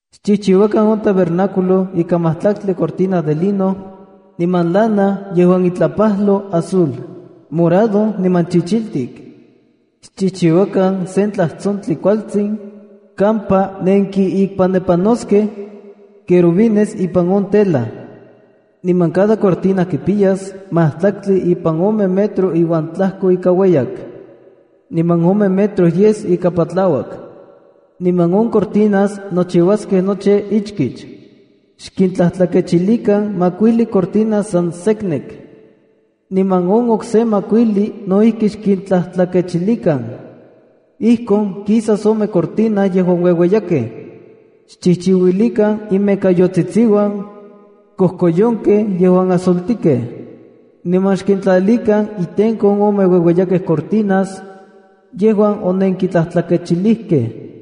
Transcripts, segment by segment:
’Xchijchiuakan on tabernáculo ika majtlaktli cortina de lino niman lana yejuan itlapajlo azul, morado niman chichiltik. Xchijchiuakan sen tlajtsontli kualtsin kampa nenkiikpanepanoskej querubines ipan on tela. Niman cada cortina kipiyas majtlaktli ipan ome metro uan tlajko ika ueyak, niman ome metro yes ika patlauak. Niman on cortinas nochiuaskej nochi ichkich. Xkintlatlakechilikan makuijli cortina san seknek. Niman on okse makuijli no ijki xkintlajtlakechilikan. Ijkon kisas ome cortina yejuan ueueyakej. Xchijchiuilikan imekayotsitsiuan kojkoyonkej yejuan azultikej, niman xkintlalikan itenko on ome ueueyakej cortinas yejuan onenkintlatlakechilikej.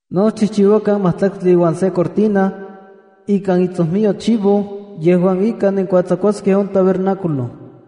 ’No xchijchiuakan majtlaktli uan se cortina ikan itsojmiyo chivo yejuan ika nenkuatsakuaskej on tabernáculo.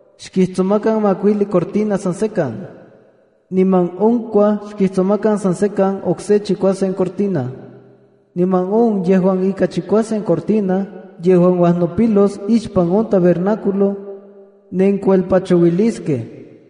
Xkijtsomakan makuijli cortina san sekan, niman onkuaj xkijtsomakan san sekan okse chikuasen cortina. Niman on yejuan ika chikuasen cortina yejuan uajnopilos ixpan on tabernáculo, nenkuelpachouiliskej.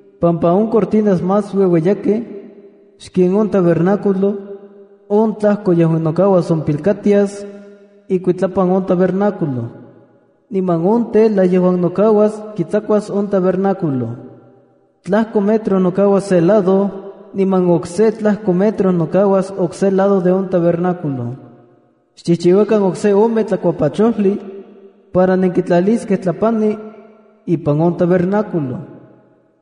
Pampa on cortinas más ueueyakej xken on tabernáculo, on tlajko yejuan nokauas ompilkatias ikuitlapan on tabernáculo. Niman on tela yejuan nokauas kitsakuas on tabernáculo. Tlajko metro nokauas se lado niman okse tlajko metro nokauas okse lado de on tabernáculo. ’Xchijchiuakan okse ome tlakuapachojli para nenkitlaliskej tlapani ipan on tabernáculo.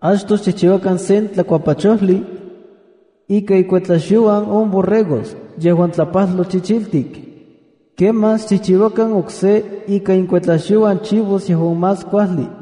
Achtoj xchijchiuakan sen tlakuapachojli ika inkuetlaxyouan on borregos yejuan tlapajloj chichiltik. Kemaj xchijchiuakan okse ika inkuetlaxyouan chivos yejuan más kuajli.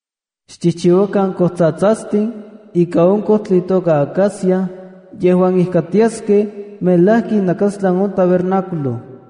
’Xchijchiuakan kojtsatsastlia ikan on kojtli itoka acacia yejuan ijkatiaskej melajki inajnakastlan on tabernáculo.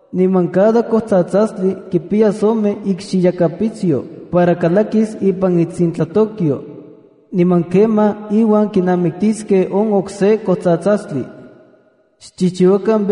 Niman cada kojtsatsastli kipiyas ome ikxiyakapitsyo para kalakis ipan itsintlatokyo, niman kemaj iuan kinamiktiskej on okse kojtsatsastli. Xchijchiuakan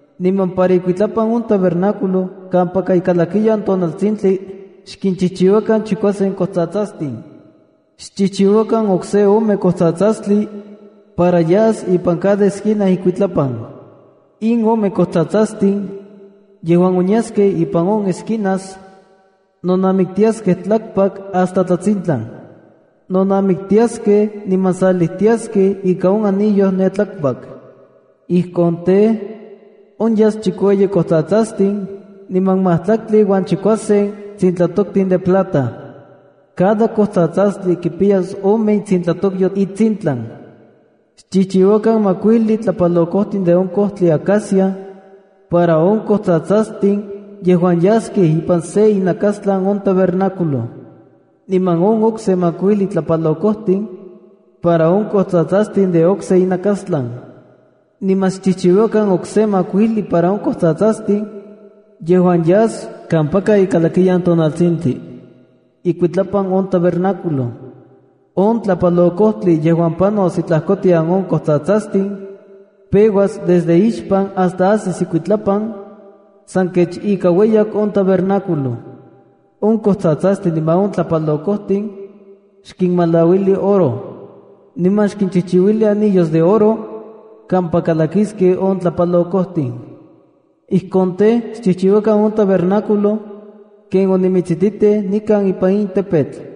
Niman para ikuitlapan on tabernáculo kampaka ikalakiyan tonaltsintli, xkinchijchiuakan chikuasen kojtsatsastin. Xchijchiuakan okse ome kojtsatsastli para yas ipan cada esquina ikuitlapan. In ome kojtsatsastin yejuan onyaskej ipan on esquinas nonamiktiaskej tlakpak hasta tlatsintlan. Nonamiktiaskej niman salijtiaskej ika on anillo ne tlakpak. Ijkon tej, onyas chikueyi kojtsatsastin niman majtlaktli uan chikuasen tsintlatoktin de plata. Cada kojtsatsastli kipiyas ome itsintlatokyo itsintlan. ’Xchijchiuakan makuijli tlapalokojtin de on kojtli acacia para on kojtsatsastin yejuan yaskej ipan se inakastlan on tabernáculo, niman on okse makuijli tlapalokojtin para on kojtsatsastin de okse inakastlan. Niman xchijchiuakan okse makuijli para on kojtsatsastin yejuan yas kampaka ikalakiyan tonaltsintli, ikuitlapan on tabernáculo. On tlapalokojtli yejuan panos itlajkotian on kojtsatsastin, peuas desde ixpan hasta asis ikuitlapan san kech ika ueyak on tabernáculo. On kojtsatsastin niman on tlapalokojtin xkinmalauili oro, niman xkinchijchiuli anillos de oro kampa kalakiskej on tlapalokojtin. Ijkon tej, xchijchiuakan on tabernáculo ken onimitsijtitij nikan ipan in tepetl.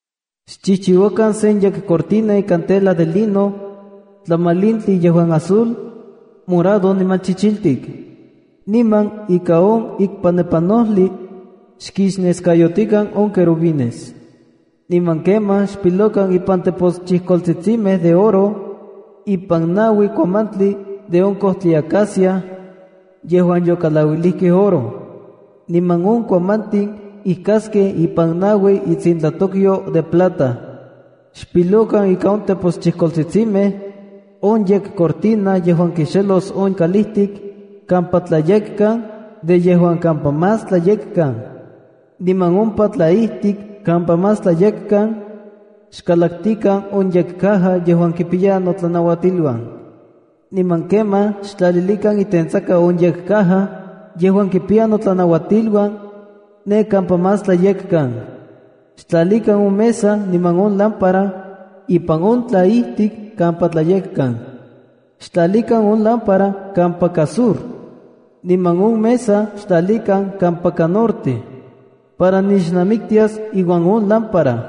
’Xchijchiuakan sen yekcortina ikan tela de lino tlamalintli yejuan azul, morado niman chichiltik. Niman ika on ikpanepanojli, xkixneskayotikan on querubines. Niman kemaj xpilokan ipan teposchijkoltsitsimej de oro ipan naui kuamantli de on kojtli acacia yejuan yokalauilijkej oro. Niman on kuamantin ijkaskej ipan naui intsintlatokyo de plata. Xpilokan ika on teposchijkoltsitsimej on yekcortina yejuan kixelos on kalijtik kampa Tlayekkan de yejuan kampa Más Tlayekkan. Niman ompa tlaijtik kampa Más Tlayekkan, xkalaktikan on yekcaja yejuan kipiya notlanauatiluan. ’Niman kemaj xtlalilikan itentsaka on yekcaja yejuan kipiya notlanauatiluan ne kampa Más Tlayekkan. Xtlalikan on mesa niman on lámpara, ipan on tlaijtik kampa Tlayekkan. Xtlalikan on lámpara kampaka sur, niman on mesab xtlalikan kampaka norte para nixnamiktias iuan on lámpara.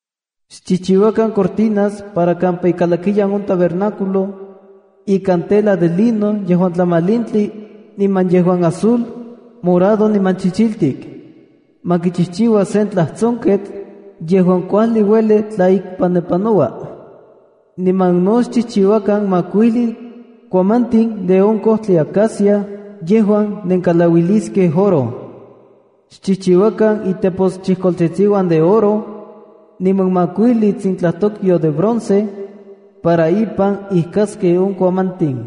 ’Xchijchiuakan cortinas para kampa ikalakiyan on tabernáculo ikan tela de lino yejuan tlamalintli niman yejuan azul, morado niman chichiltik. Ma kichijchiua sen tlajtsonketl yejuan kuajli ueli tlaikpanepanoua. Niman no xchijchiuakan makuijli kuamantin de on kojtli acacia yejuan nenkalauiliskej oro. Xchijchiuakan iteposchijkoltsitsiuan de oro, niman makuijli itsintlatokyo de bronce para ipan ijkaskej on kuamantin.